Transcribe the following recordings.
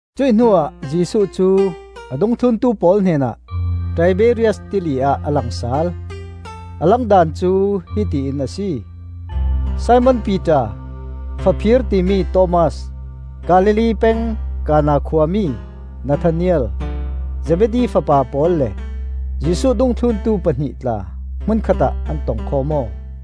Cuih hnuah Jesuh cu a dungthluntu pawl hnenah Tiberias Tili ah a lang sal. A lang daan cu hiti in a si. Simon Piter, Faphir timi Thomas, Galilee peng Kana khuami Nathanael, Zebedi fapa pawl le Jesuh dungthluntu pahnih tla hmunkhat ah an tong khawm aw.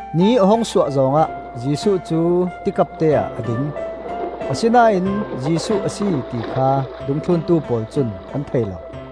Ni a hung suah zawng ah Jesuh cu tikapte-ah a ding, asinain Jesuh a si ti kha dungthluntu pawl cun an thei lo.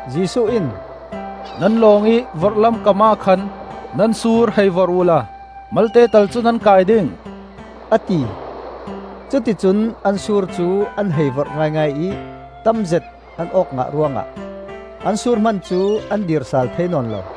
Jesuh in, “Nan lawng ih vorhlam kamah khan nan sur hei vorh uhla malte tal cu nan kai ding,” a ti. Cuti cun an sur cu an hei vorh ngaingai ih tamzet an awk ngah ruangah an sur hman cu an dir sal thei nawn lo.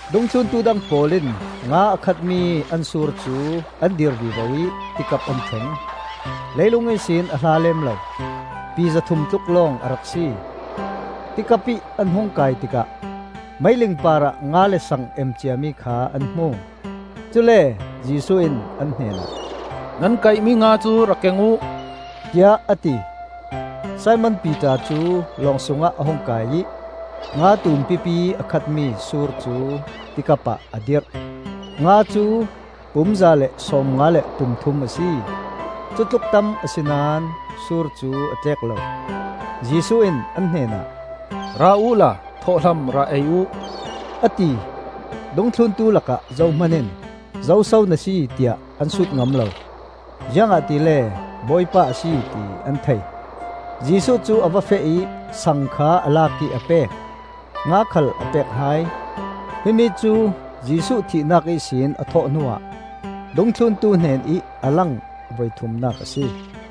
Dungthluntu dang pawl in nga a khatmi an sur cu an dir vivo ih tikap an thleng. Leilung ihsin a hla lem lo, pi zathum tluk lawng a rak si. Tikap ih an hung kai tikah meiling parah nga le saang em ciami kha an hmu. Cule Jesuh in an hnenah, “Nan kaihmi nga cu rak keng uh,” tiah a ti. Simon Piter cu lawng sungah a hung kai ih nga tumpipi a khatmi sur cu tikap ah a dirh. Nga cu pum za le sawmnga le pum thum a si; cutluk tam a si naón sur cu a tlek lo. Jesuh in an hnenah, “Ra uhla thawhhlam ra ei uh!” a ti. Dungthluntu lakah zohman in, “Zoso na si?” tiah an sut ngam lo; ziangahtile Bawipa a si ti an thei. Jesuh cu a va feh ih saang kha a lak ih a pek; nga khal a pek hai. Himi cu Jesuh thihnak ihsin a thawh hnuah dungthluntu hnenih a lang voithumnak a si.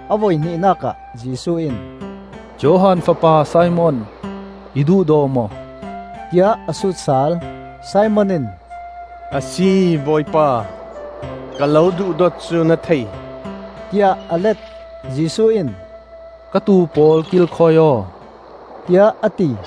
A voihnihnak ah Jesuh in, “Johan fapa Simon, i duhdaw maw,” tiah a sut sal. Simon in, “A si Bawipa, ka lo duhdawt cu na thei,” tiah a let. Jesuh in, “Ka tuu pawl kilkhawi aw,” tiah a ti.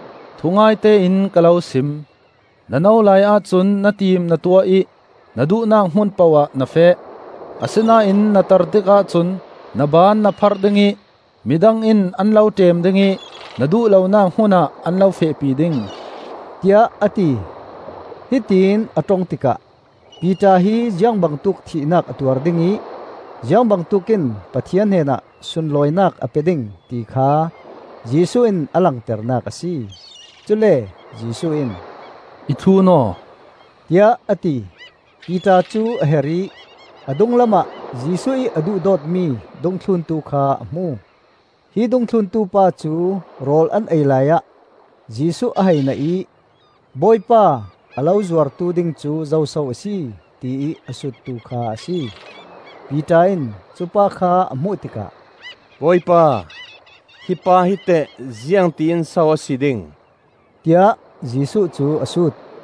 Thungaite in ka lo sim: na no laiah cun na tim na tuah ih na duhnak hmun poh ah na feh; asinain na tar tikah cun na ban na pharh ding ih midang in an lo ṭem ding ih na duh lonak hmunah an lo fehpi ding,” tiah a ti. Hitión a ṭong tikah Piter hi ziangbangtuk thihnak a tuar ding ih ziang bangtuk in Pathian hnenah sunlawinak a pe ding, ti kha Jesuh in a langternak a si. Cule Jesuh in, “I thlun aw,” tiah a ti. Piter cu a her ih a dunglamah Jesuh ih a duhdawtmi dungthluntu kha a hmu. Hi dungthluntu pa cu rawl an ei laiah Jesuh a hei naih ih, “Bawipa, a lo zuartu ding cu zoso a si?” tiih a suttu kha a si. Piter in cupa kha a hmuh tikah, “Bawipa, hi pa hi teh ziangti in so a si ding?” tiah Jesuh cu a sut.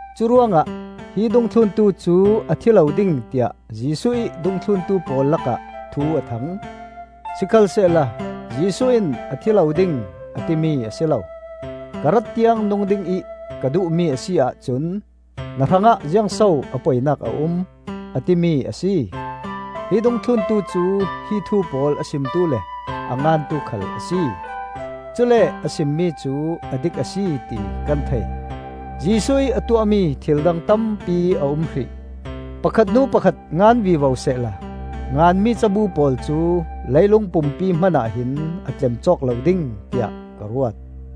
Curuangah hi dungthluntu cu a thi lo ding tiah Jesuh ih dungthluntu pawl lakah thu a thang. Sikhalsehla Jesuh in a thi lo ding, a timi a si lo: “Ka rat tiang nung dingih ka duhmi a si ahcun na hrangah ziangso a poinak a um?” a timi a si. Hi dungthluntu cu hi thu pawl a simtu le a ngantu khal a si; cule a simmi cu a dik a si ti kan thei. Jesuh ih a tuahmi thil dang tampi a um hrih. Pakhat hnu pakhat ngan vivo sehla nganmi cabu pawl cu leilung pumpi hmanah hin a tlem cawk lo ding tiah ka ruat.